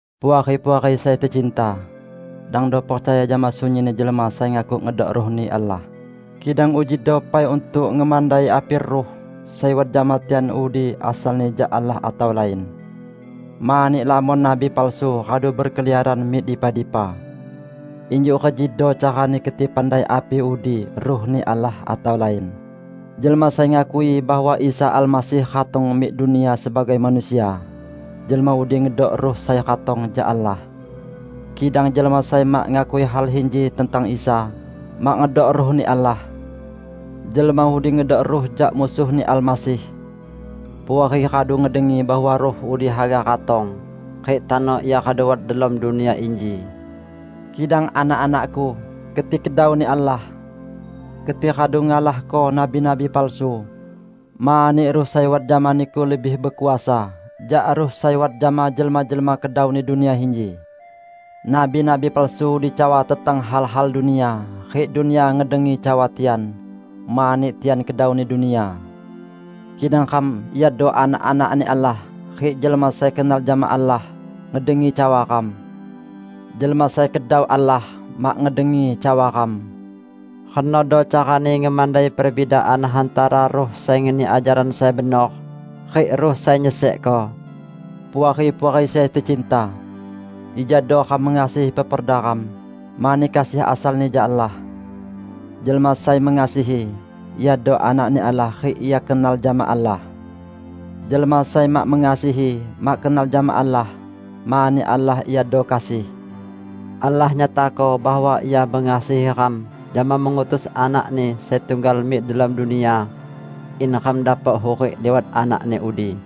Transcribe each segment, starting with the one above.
Puari-puariku sai tecinta! Dangdo percaya jama sunyin jelma sai ngaku ngedok Ruh-Ni Allah, kidang ujido pai untuk ngemandai api ruh sai wat jama tian udi asalni jak Allah atau lain. Mani lamon nabi palsu radu bekeliaran mik dipa-dipa. Injuk rejido carani keti pandai api udi Ruh-Ni Allah atau lain: Jelma sai ngakui bahwa Isa Almasih ratong mik dunia sebagai manusia, jelma udi ngedok Ruh sai ratong jak Allah. Kidang jelma sai mak ngakui hal inji tentang Isa, mak ngedok Ruh-Ni Allah. Jelma udi ngedok ruh jak Musuh-Ni Almasih. Puari radu ngedengi bahwa ruh udi haga ratong, rik tano ia radu wat delom dunia inji. Kidang anak-anakku, keti kedau-Ni Allah. Keti radu ngalahko nabi-nabi palsu, mani Ruh sai wat jama niku lebih bekuasa jak ruh sai wat jama jelma-jelma kedauni dunia inji. Nabi-nabi palsu udi cawa tentang hal-hal dunia, rik dunia ngedengi cawa tian, mani tian kedauni dunia. Kidang ram iado anak-anak-Ni Allah; rik jelma sai kenal jama Allah, ngedengi cawa ram. Jelma sai kedau Allah, mak ngedengi cawa ram. Renodo carani ngemandai perbidaan hantara Ruh sai ngeni ajaran sai benor, rik ruh sai nyesekko. Puari-puari sai tecinta! Ijado ram mengasihi peperda ram, mani kasih asalni jak Allah. Jelma sai mengasihi, iado anak-Ni Allah rik ia kenal jama Allah. Jelma sai mak mengasihi, mak kenal jama Allah; mani Allah iado kasih. Allah nyatako bahwa Ia mengasihi ram jama mengutus Anak-Ni sai tunggal mik delom dunia in ram dapok hurik liwat Anak-Ni udi.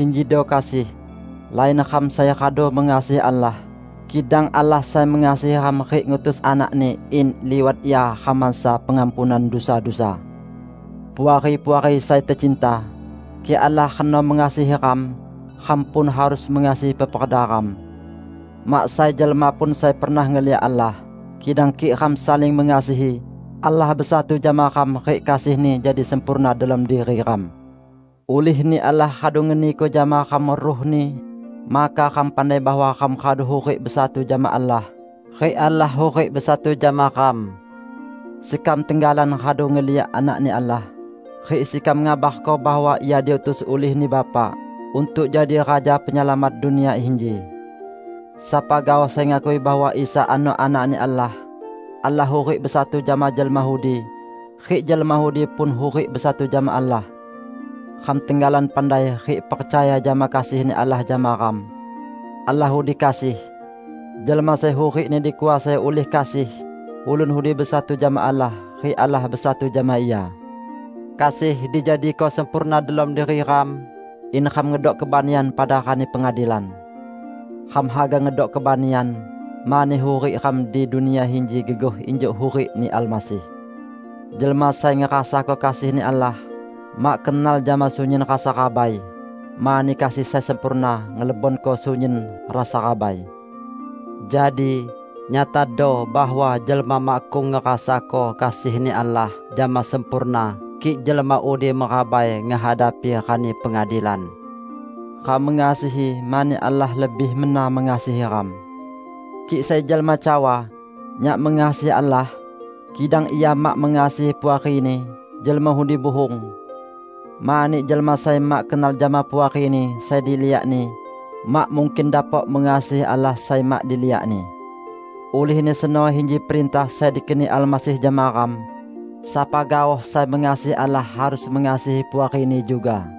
Injido kasih: Lain ram sai radu mengasihi Allah, kidang Allah sai mengasihi ram rik ngutus Anak-Ni in liwat Ia ram mansa pengampunan dusa-dusa. Puari-puari sai tecinta, kik Allah reno mengasihi ram, ram pun harus mengasihi peperda ram. Mak sai jelma pun sai pernah ngeliak Allah, kidang kik ram saling mengasihi, Allah besatu jama ram rik kasih-Ni jadi sempurna delom diri ram. Ulih-Ni Allah radu ngeniko jama ram Ruh-Ni, maka ram pandai bahwa ram radu hurik besatu jama Allah, rik Allah hurik besatu jama ram. Sekam tenggalan radu ngeliak Anak-Ni Allah, rik sekam ngabarko bahwa Ia diutus ulih-Ni Bapa untuk jadi Raja Penyelamat dunia inji. Sapa gaoh sai ngakui bahwa Isa ano Anak-Ni Allah, Allah hurik besatu jama jelma udi, rik jelma udi pun hurik besatu jama Allah. Ram tenggalan pandai rik percaya jama kasih-Ni Allah jama ram. Allah udi kasih. Jelma sai hurikni dikuasai ulih kasih, ulun udi besatu jama Allah, rik Allah besatu jama ia. Kasih dijadiko sempurna delom diri ram, in ram ngedok kebanian pada Rani Pengadilan. Ram haga ngedok kebanian, mani hurik ram di dunia inji gegoh injuk hurik-Ni Almasih. Jelma sai ngerasako kasih-Ni Allah, mak kenal jama sunyin rasa rabai; mani kasih sai sempurna ngelebonko sunyin rasa rabai. Jadi nyatado bahwa jelma makkung ngerasako kasih-Ni Allah jama sempurna kik jelma udi merabai ngehadapi Rani Pengadilan. Ram mengasihi, mani Allah lebih mena mengasihi ram. Kik sai jelma cawa, "Nyak mengasihi Allah", kidang ia mak mengasihi puarini, jelma udi buhung. Mani jelma sai mak kenal jama puarini sai diliakni, mak mungkin dapok mengasihi Allah sai mak diliakni. Ulihni seno inji perintah sai dikeni Almasih jama ram: Sapa gaoh sai mengasihi Allah harus mengasihi puarini juga.